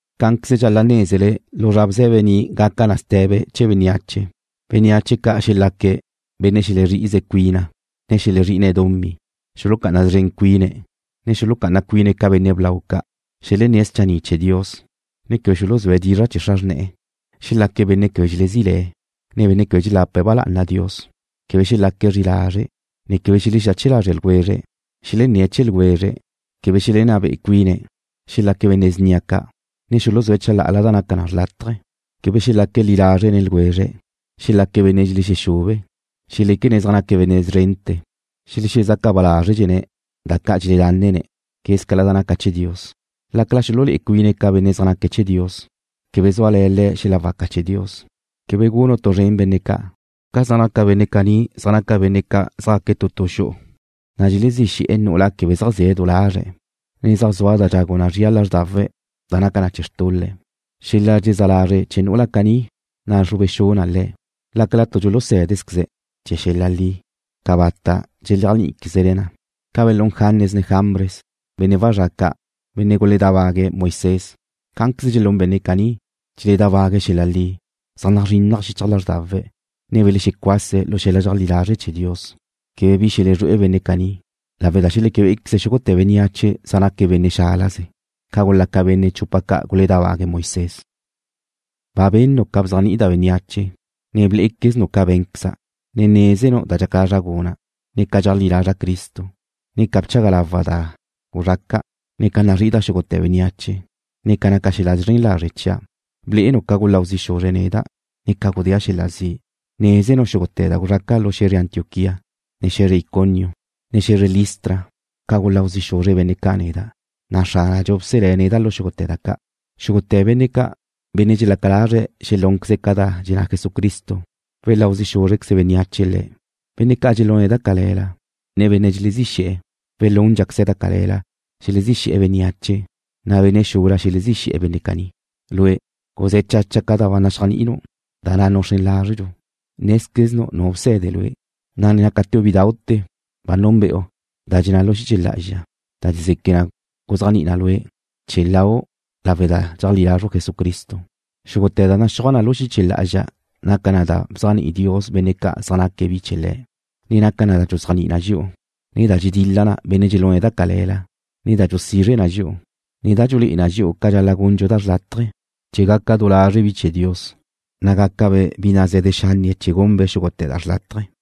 Cá'anqueze dxal-la' nézele lu zra bze̱be ni' gaca na ste̱be chee̱ bénneache. Bénneache ca' xelaque̱': Benne' xelezrí'ize cuina, ne xelezrí'ine̱' dumí. Xulucá'ana szren cuine̱', ne xulucá'ana cuine̱' ca benne' blau ca'. Xelenné̱' schanni' chee̱ Dios, ne quebe xuluzúe̱' dizra' chee̱ xra xrne̱'e̱. Xelaque̱' benne' quebe dxelezí le̱, ne benne' quebe dxelapa ba lá'ana Dios. Quebe xelaque̱' zri'i lazre', ne quebe xelexexache lazre̱' ljwezre̱'. Xelenné̱' chee̱ ljwezre̱', ne quebe xelenná be'e cuine̱'. Xelaque̱' benne' snia ca', ne xuluzúe̱' chalá'ala da naca xrlátaje. Quebe xelaque̱' li lazre' nen ljwezre̱'. Xelaque̱' benne' dxelexube. Xeléquene̱' zaj naque̱' benne' szrente̱. Xelexezaca ba lázredxene̱' da ca' dxeledánene̱' quézcala da naca chee̱ Dios. Lácala xululé'e cuine̱' ca benne' zaj naque̱' chee̱ Dios, quebe súale̱ le̱' xel-la waca chee̱ Dios. Quebe gunu' tu zrén benne' ca'. Ca zaj naca benne' caní zaj naca benne' ca' zjaque̱' tu tu xu'u, ne dxelezí xe̱'e̱ nu'ula quebe zaj zie̱' du lazre', ne zaj zua da dxagu na zria lázrdawe̱' da naca chee̱ xtul-le'. Xel-la dxelezá lazre' chee̱ nu'ula caní nazrube xu na le̱'. Lácala tu dxulusé̱dezqueze̱' chee̱ xel-la li, cabata' dxeléajni'iquezne̱' na. Ca belún Janes ne Jambres, benne' wazrá' ca', benne' ca' guledábague̱' Moisés, cá'anqueze dxelún benne' caní, dxeledábague̱' xel-la li. Zaj nazrinnaj xichaj lázrdawe̱', ne belexecuase̱' lu xel-la dxeajlí lazre' chee̱ Dios. Quebe bi xelezrué'e benne' caní, lawe' da xeleque bé'equeze xúgute̱ bénneache zaj naque̱' benne' xálaze, ca gulaca benne' chupa ca' guledábague̱' Moisés. Ba benu': Ca da bzéajni'ida' bénneache, ne blé'equeznu' ca bé̱nqueza'. Nézenu' da dxaca lazra' guna', ne ca dxeajlí lazra' Cristo. Bchaga lawa' da guzxaca', ne nazrí'ida' xúgute̱ bénneache. Nézenu' ca naca xel-la zren lazre' chia'. Blé'enu' ca guláu zi' xuzre̱' neda', ne ca gudéa' xel-la zi'. Nézenu' xúgute̱ da guzraca' lu xe̱zre Antioquía, ne xe̱zre Iconio, ne xe̱zre Listra. Guláu zi' xuzre benne' ca' neda', na' Xránadxu bselé̱' neda' lu xúgute̱ da ca'. Xúgute̱ benne' ca', benne' dxelaca lazre̱' xelúnqueze̱' ca da dxenná Jesucristo, weláu zi' xúzrequeze bénneache le̱'. Benne' ca' dxelune̱' da cale̱la, ne benne' dxelezí xe̱'e̱ welúndxaqueze̱' da cale̱la. Xelezí xe̱'e̱ bénneache, na' benne' xula xelezí xe̱'e̱ benne' caní. Lue', guzé̱ chacha ca da ba naxéajni'inu', da na' nuxrén lazru'. Nézqueznu' nu bse̱de lue', na' ne nácateu' bídau'te̱ ba núnbe'u da dxenná lu xiche lá'azxa, da dxezeque na guzéajni'i na lue', chee̱ lau' lawe' da dxeajlí lazru' Jesucristo. Xúgute̱ da naxúaj na lu xiche lá'azxa naca na da bzéajni'i Dios benne' ca' zaj naque̱' bi chee̱ Le̱', ne naca na da dxuzéajni'i na dxi'u, ne da dxedil-la na benne' dxelune̱' da cale̱la, ne da dxusizre na dxi'u, ne da dxulé'e na dxi'u ca dxal-la' gundxu da xrlátaje, chee̱ gaca du lazre' bi chee̱ Dios, na' gácabe' bi naze̱de xanne chee̱ gunbe' xúgute̱ da xrlátaje.